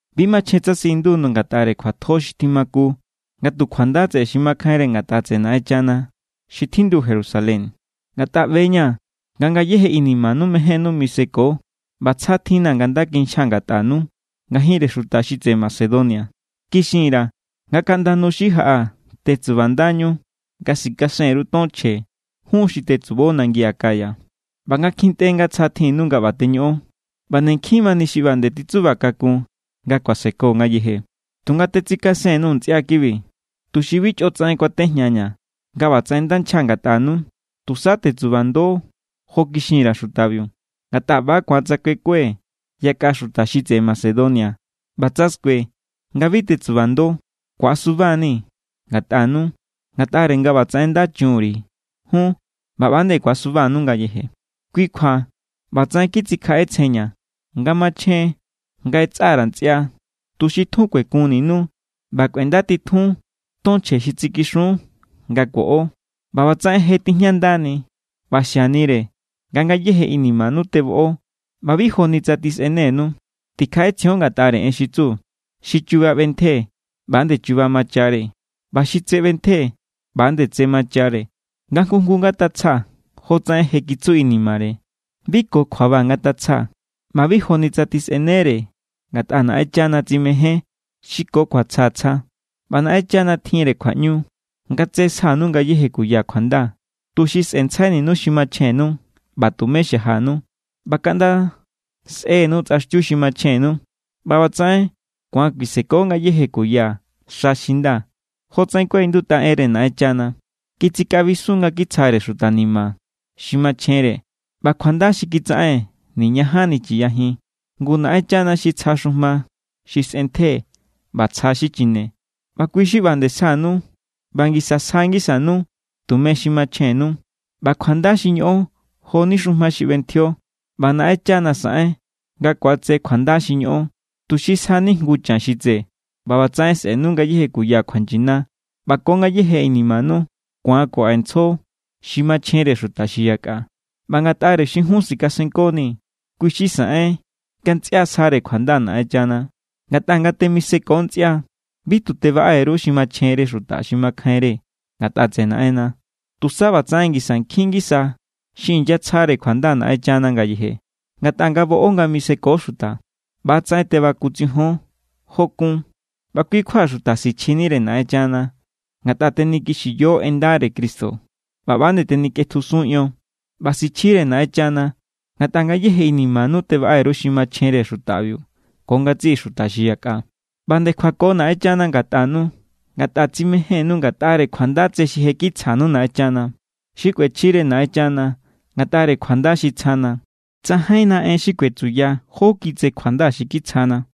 Bi machjen tsa siꞌindu_nuu̱ ngatꞌare kjuatjo xi tjimaku nga tu kjuanda tseꞌe xi makjainre ngatꞌa tseꞌe Naꞌenchana xi tjindu Jerusalén. Ngatꞌa ꞌbe=ña̱ nga ngayéje inimanu mejénnu miseko ꞌba tsja tjinna̱ nga nda kinchjaa̱ ngatꞌanu ngajinre xuta xi tseꞌe Macedonia. Kixin_ra̱ nga kaꞌnda nu xi jaꞌa tetsubandañu nga sikasen_ru ton chje jun xi tetsubo nangi Acaya. ꞌBa nga kjintꞌe nga tsja tjinnu nga ꞌba teñoꞌon, ꞌba nde nkjin mani xi ꞌba nde titsuba kakun nga kuaseko ngayeje. Tunga tetsikasekun_nuu̱ ntsꞌia kibi, tuxi bi chꞌotsaꞌen kuatejñaña̱ nga ꞌbatsaꞌen nda nchja ngatꞌanu, tusa tetsubando jo kixin_ra̱ xutabiu. Ngatꞌa ꞌba ku̱an tsa kuekue yakꞌa xuta xi tseꞌe Macedonia ꞌba tsa skue nga bi tetsubando, ku̱asuba=ni̱ ngatꞌanu ngatꞌare nga ꞌbatsaꞌen nda chun_ri̱ jun ꞌba ꞌba nde ku̱asubanu ngayeje. Kui kjua ꞌbatsaꞌen kitsikjaꞌetsjenña̱ nga machjen nga ꞌetsa_ra̱ ntsꞌia, tuxi tjun kuekunninu ꞌba kꞌuendatitjun ton chje xi tsikixun nga kuoꞌo. ꞌBa ꞌbatsaꞌen je tijñandani ꞌba xianire nga ngayéje inimanu teboꞌo ꞌba bi joni tsa tjisꞌenenu. Tikjaꞌetsjion ngatꞌare en xi tsu: Xi chuba ꞌbentje, ꞌba=nde chuba machare; ꞌba xi tse ꞌbentje, ꞌba=nde tse machare. Nga nga jngu jngu ngatatsja jotsaꞌen je kitsu inimare. Bi ko kjuaba ngatatsja, ꞌba bi joni tsa tjisꞌenere ngatꞌa Naꞌenchana tsimején= xi ko kjuatsja tsja. ꞌBa Naꞌenchana tjinre kjuaꞌñu nga tse sjanu ngayéje kuya kjuanda, tuxi sꞌe̱ntsjaininu xi machjennu ꞌba tumé xajanu. ꞌBa kaꞌnda sꞌe̱nu tsꞌaxtiu xi machjennu, ꞌba ꞌbatsaꞌen ku̱an kuiseko ngayéje kuya xa xi nda. Jotsaꞌen kuaꞌindutꞌa enre Naꞌenchana: Kitsikaꞌbisun nga kitsjare xuta ni̱ma̱ xi machjenre. ꞌBa kjuanda xi kitsaꞌen niñajanni chiyajin. Ngu Naꞌenchana xi tsja xujma xi sꞌentje ꞌba tsja xi chine, ꞌba kui xi ꞌba nde sjanu ꞌba ngisa sja ngisanu tume xi machjennu. ꞌBa kjuanda xi ñoꞌon jo=ni xujma xi ꞌbentjio, ꞌba Naꞌenchana saꞌen nga ku̱atse kjuanda xi ñoꞌon, tuxi sjani jngu chan xi tse. ꞌBa ꞌbatsaꞌen sꞌe̱nu ngayéje kuya kjuanyina, ꞌba ko ngayéje inimanu ku̱an kuaꞌentsjo xi machjenre xuta xi yakꞌa. ꞌBa ngatꞌare xi jun sikasenkonii̱, kui xi saꞌen nga ntsꞌia sjare kjuanda Naꞌenchana. Ngatꞌa nga temiseko ntsꞌia, bi tu tebaꞌe_ru xi machjenre xuta xi makjainre ngatꞌa tseꞌe Naꞌenna, tusa ꞌbatsaꞌen ngisa nkjin ngisa xi inyatsjare kjuanda Naꞌenchana ngayeje. Ngatꞌa nga boꞌo nga miseko xuta, ꞌbatsaꞌen tebakutsijon jo kuún. ꞌBa kui kjua xuta sichjinire Naꞌenchana, ngatꞌa tenikixiyo en ndare Cristo ꞌba ꞌba nde tenikꞌetjusun ion. ꞌBa sichjire Naꞌenchana ngatꞌa ngayéje inimanu tebaꞌe_ru xi machjenre xutabiu ko ngatsiꞌi xuta xi yakꞌa. ꞌBa nde kjuako Naꞌenchana ngatꞌanu ngatꞌa tsimejénnu ngatꞌare kjuanda tse xi je kitsjanu Naꞌenchana. ¡Xikꞌuechjire Naꞌenchana ngatꞌare kjuanda xi tsjana! ¡Tsajainna en xi kuetsuya jó kjiꞌi tse kjuanda xi kitsjana!